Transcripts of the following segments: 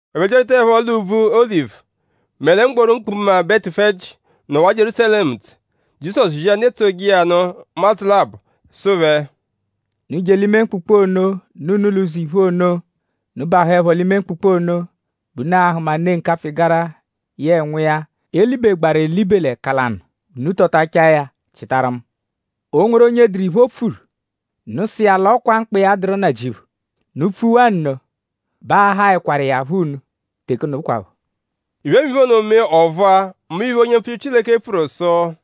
Ẹphe byarwutaẹpho l'úbvú Olivu; mẹ lẹ mgboru mkpụkpu Betufeji, nọwaa Jierúsalẹmu ntse; Jizọsu zia ndu etsoje iya nụ ụmadzu labọ; sụ phẹ: “Unu je l'ime mkpụkpu ono, nọ unu l'ụzo iphu ono. Unu -bahụepho l'ime mkpụkpu ono bẹ unu a-hụma ne nkapfụ-ịgara yẹe nwa iya, e libegbaaru elibe l'ẹka lanụ. Unu tọtachaa ya chịtaru mu. Ọ -nweru onye dụru iphe o pfuru; unu sụ iya l'ọ kwa mkpa iya dụru Nnajịuphu. Unu -pfuwaa nno bẹ aa-haẹkwaru iya phọ unu teke ono kwaphọ.” Iphemiphe ono mee ọ vụa; mbụ iphe, onye mpfuchiru Chileke pfuru sụ: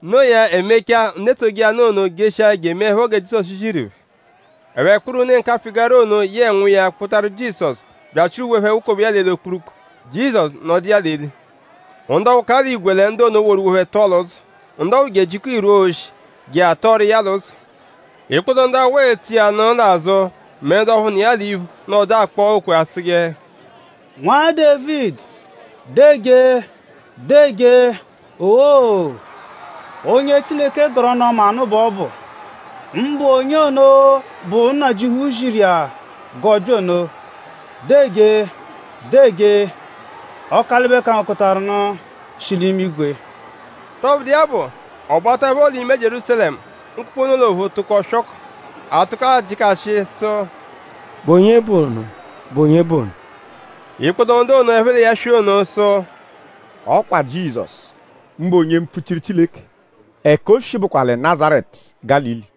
No iya; e mechaa; ndu etsoje iya nụ ono jeshia je emeẹpho gẹ Jizọsu ziru phẹ. Ẹphe kpụru ne nkapfụ-ịgara ono yẹe nwa iya kpụtaru Jizọsu bya achịru uwe phẹ wukobe iya l'eli okpurukpu; Jizọsu nọdu iya l'eli. Ndu ọphu ka l'igwe lẹ ndu ono woru uwe phẹ tọo l'ụzo. Ndu ọphuu je ejikọo irwu oshi je atọoru iya l'ụzo. Ikpoto ndu awụ etso iya l'azụ mẹ ndu ọphu nọ iya l'iphu nọdu akpọ okwe asụje: “Nwa Dévidi, deejee! Deejee! Owoo! Onye Chileke gọru ọnu-ọma nụ bẹ ọ bụ; mbụ onye ono, bụ Nnajịuphu ziru iya g'ọ bya ono. Deejee! Deejee! Ọkalibe-kangokọtaru-nụ, shi l'imigwe!” Tọbudu iya bụ; ọ bataẹpho l'ime Jierúsalẹmu; mkpụkpu ono l'ophu tụko swọkobe. A tụko ajịkashi sụ: “?Bụ onye bụ ono??Bụ onye bụ ono?” Ikpoto ndu ono, ẹphe l'iya swị ono sụ: “Ọ kwa Jizọsu; mbụ onye mpfuchiru Chileke. Ẹka o shi bụkwa lẹ Nazaretu Gálili.”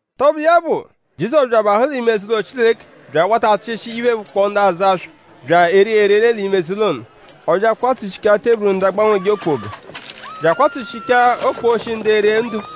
Tọbudu iya bụ; Jizọsu bya abahụ l'ime eze-ụlo Chileke bya awata achịshi iphe, bụkpoo ndu azụ aswa bya ere erere l'ime eze-ụlo ono. Ọ bya akwatsushichaa teburu ndu agbanweje okpoga; bya akwatsushichaa okposhi ndu ere ndo.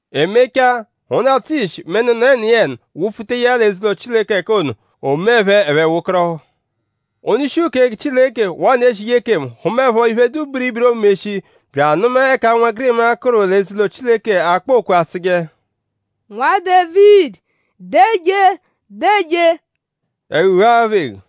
E mechaa; ndu atsụ ishi mẹ ndu nọ ẹniyeni wụ-pfuta iya l'eze-ụlo Chileke l'ẹka ono; o mee phẹ ẹphe wekọrohu. Ndu-ishi uke Chileke waa ndu ezije ekemu hụmaepho iphe, dụ biribiri, oomeshi bya anụma ẹka ụnwegirima, kụru l'eze-ụlo Chileke akpọ okwe asụje: “Nwa Dévidi; deejee; deejee;” ẹhu ghuahaa phẹ eghu.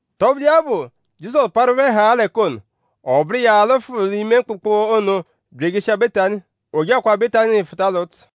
Tọbudu iya bụ; Jizọsu parụ phẹ haa l'ẹka ono; ọ bụru iya alụfu l'ime mkpụkpu ono bya ejeshia Betani. O je akwaa Betani fụta l'ụtsu.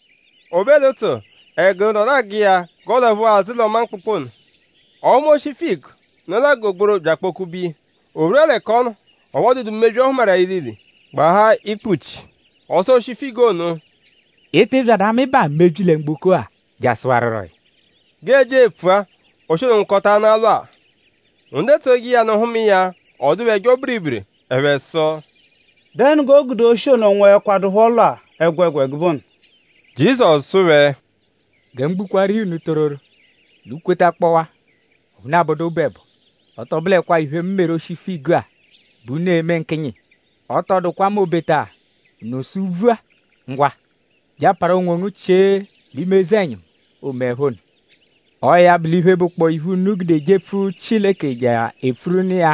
O be l'ụtsu; ẹgu nọdu agụ iya g'ọolaphuwa azụ l'ọma mkpụkpu ono. Ọ hụma oshi figu, nọ l'agụga gbororo bya akpọ-kube iya. O rwua l'ẹka ọ nọ; ọphu ọ dụdu mebyi, ọ hụmaru iya ilile; gbahaa ikpuchi. Ọ sụ oshi figu ono: “Ị tị byadu amịbaa mebyi lẹ mgboko-a jasụwaruro ya.” G'e jia epfua; oshi ono nwụkotaanaa lwaa. Ndu etsoje iya nụ hụma iya; ọ dụ phẹ ẹjo biribiri. Ẹphe sụ: “?Dẹnu g'o gude oshi ono nwụekwadupho lwa ẹgwegwa ẹgube ono?” Jizọsu sụ phẹ: “Gẹ mu gbukwaaru iya unu tororo; unu -kwetakpọwaa; ọphu unu abọdu obu ẹbo; ọ tọ bụlekwaa iphe, mu meru oshi figu-a bẹ unu e-me nkịnyi iya; ọ tọ dụkwa m'obeta unu sụ úbvú-a: ‘Ngwa; je aparu onwongu chie l'ime eze-ẹnyimu’; oomeẹpho nno. Ọo ya bụ l'iphe, bụkpoo iphe, unu gude jepfu Chileke je epfuru nụ iya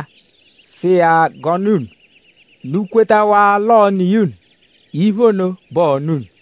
sụ iya g'ọ nụ unu; unu kwetawaa l'ọo-nụ iya unu; iphe ono bẹ ọo-nụ unu.”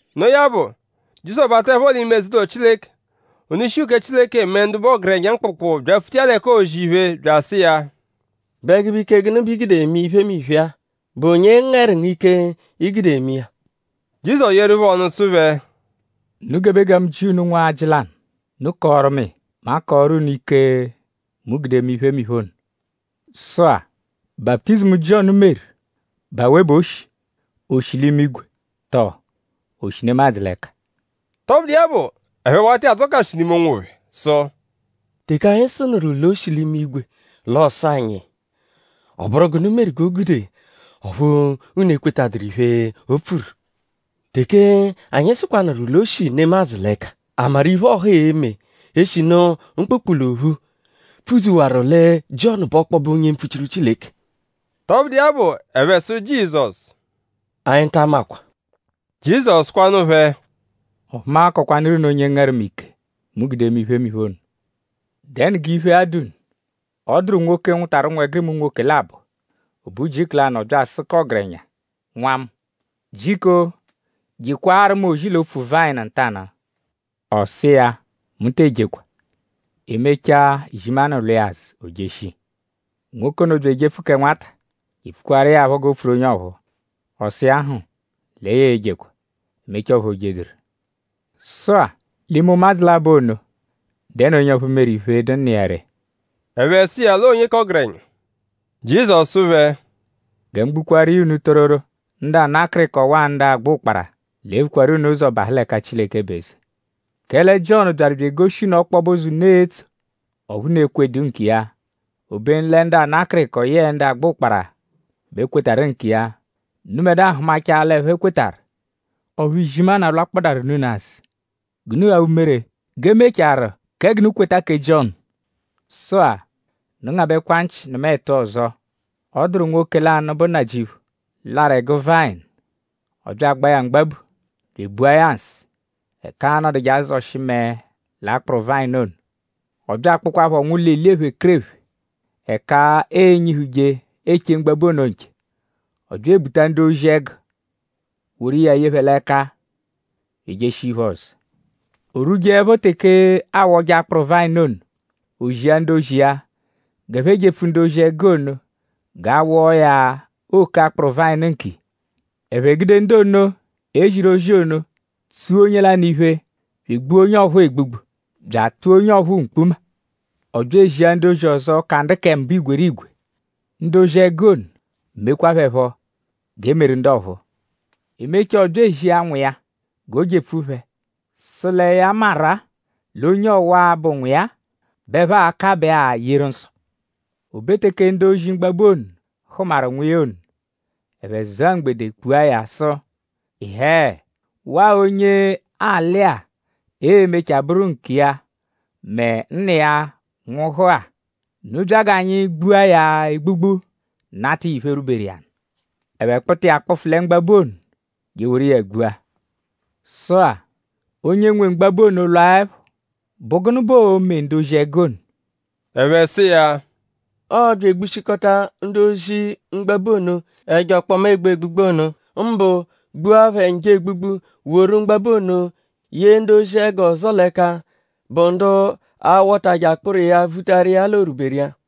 Noo ya bụ; Jizọsu bataẹpho l'ime eze-ụlo Chileke; ndu-ishi uke Chileke mẹ ndu bụ ọgerenya mkpụkpu byapfuta iya l'ẹka oozi iphe bya asụ iya: “?Bụ ẹgube ike gụnu bẹ i gude eme iphemiphe-a??Bụ onye ngẹru ngu ike, i gude eme iya?” Jizọsu yeeru phẹ ọnu sụ phẹ: “Unu gebe gẹ mu jịa unu nwajị lanụ. Unu -kọoru mu iya; mu akọoru unu ike, mu gude eme iphemiphe ono. Sụ-a;?baputizimu, Jiọnu meru;?bụ awe bẹ o shi??O shi l'imigwe? Tọo?o shi nemadzụ l'ẹka?” Tọbudu iya bụ; ẹphe wata iya adzọkashi l'ime onwophẹ sụ: “Teke anyi sụnuru l'o shi l'imigwe l'ọ sụ anyi: ‘?Ọ bụru gụnu meru g'o gude ọphu unu ekwetaduru iphe, o pfuru?’ Teke anyi sụkwanuru l'o shi nemadzụ l'ẹka;?a maru iphe, ọha e-me; eshinu mkpụkpu l'ophu pfudzuwaru lẹ Jiọnu bụ ọkpobe onye mpfuchiru Chileke?” Tọbudu iya bụ; ẹphe sụ Jizọsu: “Anyi ta amakwa.” Jizọsu sụkwanu phẹ: “Ọphu mu akọkwanuru unu onye ngẹru mu ike, mu gude eme iphemiphe ono.” “?Dẹnu g'iphe-a dụ unu? Ọ dụru nwoke, nwụtaru ụnwegirima unwoke labọ. O be ujiku lanụ; ọ bya asụ k'ọgerenya: ‘Nwa mu; jiko jekwaaru mu ozi l'opfu-vayịnu ntanụ.’ Ọ sụ iya: Mu tee jekwa.” E mechaa; izimanụ lwa iya azụ; o jeshia. Nwoke ono bya ejepfu kẹ nwata je epfukwaaru iya phọ g'o pfuru onye ọphuu. Ọ sụ iya hm lẹ ya e-jekwaa. E mechaa; ọphu o jeduru. Sụ-a; l'ime ụmadzu labọ ono;?dẹnu onye ọphu meru iphe, dụ nna iya ree? Ẹphe sụ iya l'ọo onye k'ọgerenya. Jizọsu sụ phẹ: “Gẹ mu gbukwaaru iya unu tororo; ndu ana akịriko waa ndu agba ụkpara l'e-vukwaru unu ụzo bahụ l'ẹka Chileke bụ eze. Kẹle Jiọnu byaru bya egoshi unu ọkpobe ụzo, unu e-tso; ọphu unu ekwedu nkiya; obenu lẹ ndu ana akịriko yẹe ndu agba ụkpara bẹ kwetarụ nkiya. Unubẹdua hụmachaa l'ẹphe kwetarụ; ọphu izimanụ alwakpọdarunu unu azụ; g'unu ghaa umere g'e mechaarụ kẹ g'unu kweta kẹ Jiọnu.” “Sụ-a; unu ngabẹkwa nchị nụma ẹtu ọzo. Ọ dụru nwoke lanụ, bụ nnajịuphu, larụ ẹgu vayịnu. Ọ bya agbaa ya mgbabu; bya ebua ya nsụ ẹka aanọduje azọshi mẹe l'akpụru vayịnu ono. Ọ bya akpụkwaapho nwụlo eli ephekerephe ẹka ee-nyihuje eche mgbabu ono nche. Ọ bya ebuta ndu-ozi-ẹgu woru iya ye phẹ l'ẹka bya ejeshia iphe-ọzo. O rwujeẹpho teke aawọje akpụru vayịnu ono; o zia ndu-ozi iya g'ẹphe jepfu ndu-ozi-ẹgu ono g'a wọo ya òkè akpụru vayịnu nkiya. Ẹphe gude ndu ono, e ziru ozi ono tsua onye lanụ iphe; bya egbua onye ọphuu egbugbu; bya atụa onye ọphuu mkpuma. Ọ bya ezia ndu-ozi ọzo, ka ndu kẹ mbụ igwerigwe. Ndu ozi-ẹgu ono mekwaa phẹ phọ g'e meru ndu ọphuu. E mechaa; ọ bya ezia nwa iya g'o jepfu phẹ sụ lẹ ya maru-a l'onye ọwa-a, bụ nwa iya-a bẹ ẹphe a-kabẹ-a yeru nsọ. O be teke ndu-ozi-mgbabu ono hụmaru nwa iya ono; ẹphe zụa mgbede kpua ya sụ: ‘Ịhee! Waa onye alị-a e-mechaa bụru nkiya mẹ nna iya nwụhu-a. Unu bya g'anyi gbua ya egbugbu nata iya iphe, rwuberu iya nụ.’ Ẹphe kpụta iya kpụfu lẹ mgbabu ono je eworu iya gbua. “Sụ-a; onye nwe mgbabu ono -lwaẹpho;?bụ gụnu bẹ oo-me ndu-ozi-ẹgu ono?” Ẹphe sụ iya: “Ọo-bya egbushikọta ndu-ozi-mgbabu ono, ẹjo ọkpoma egbu egbugbu ono; mbụ gbua phẹ njọ egbugbu woru mgbabu ono ye ndu-ozi-ẹgu ọzo l'ẹka, bụ ndu a-wọtaje akpụru iya vutaru iya l'o rwuberu iya.”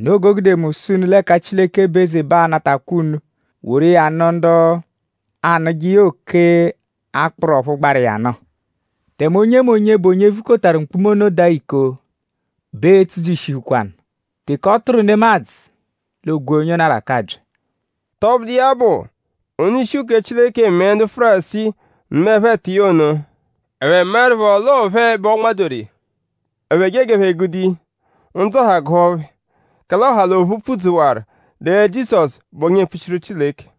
“Noo g'o gude mu sụ unu l'ẹka Chileke bụ eze bẹ a-natakwa unu woru iya nụ ndu a-nụje iya òkè akpụru, ọphu gbaru iya nụ. Tẹme onyemonye, bụ onye vukotaru mkpuma ono daa iko bẹ e-tsujishihukwanu; teke ọ tụru nemadzụ l'o gwee onye ono arakabya.” Tọbudu iya bụ; ndu-ishi uke Chileke mẹ ndu Fárisii nụmaepho ẹtu iya ono; ẹphe maẹrupho l'ọo phẹ bẹ ọonmadoru iya. Ẹphe jee g'ẹphe gude iya; ndzụ ọha gụhu phẹ; kẹle ọha l'ophu pfudzuwaru lẹ Jizọsu bụ onye mpfuchiru Chileke.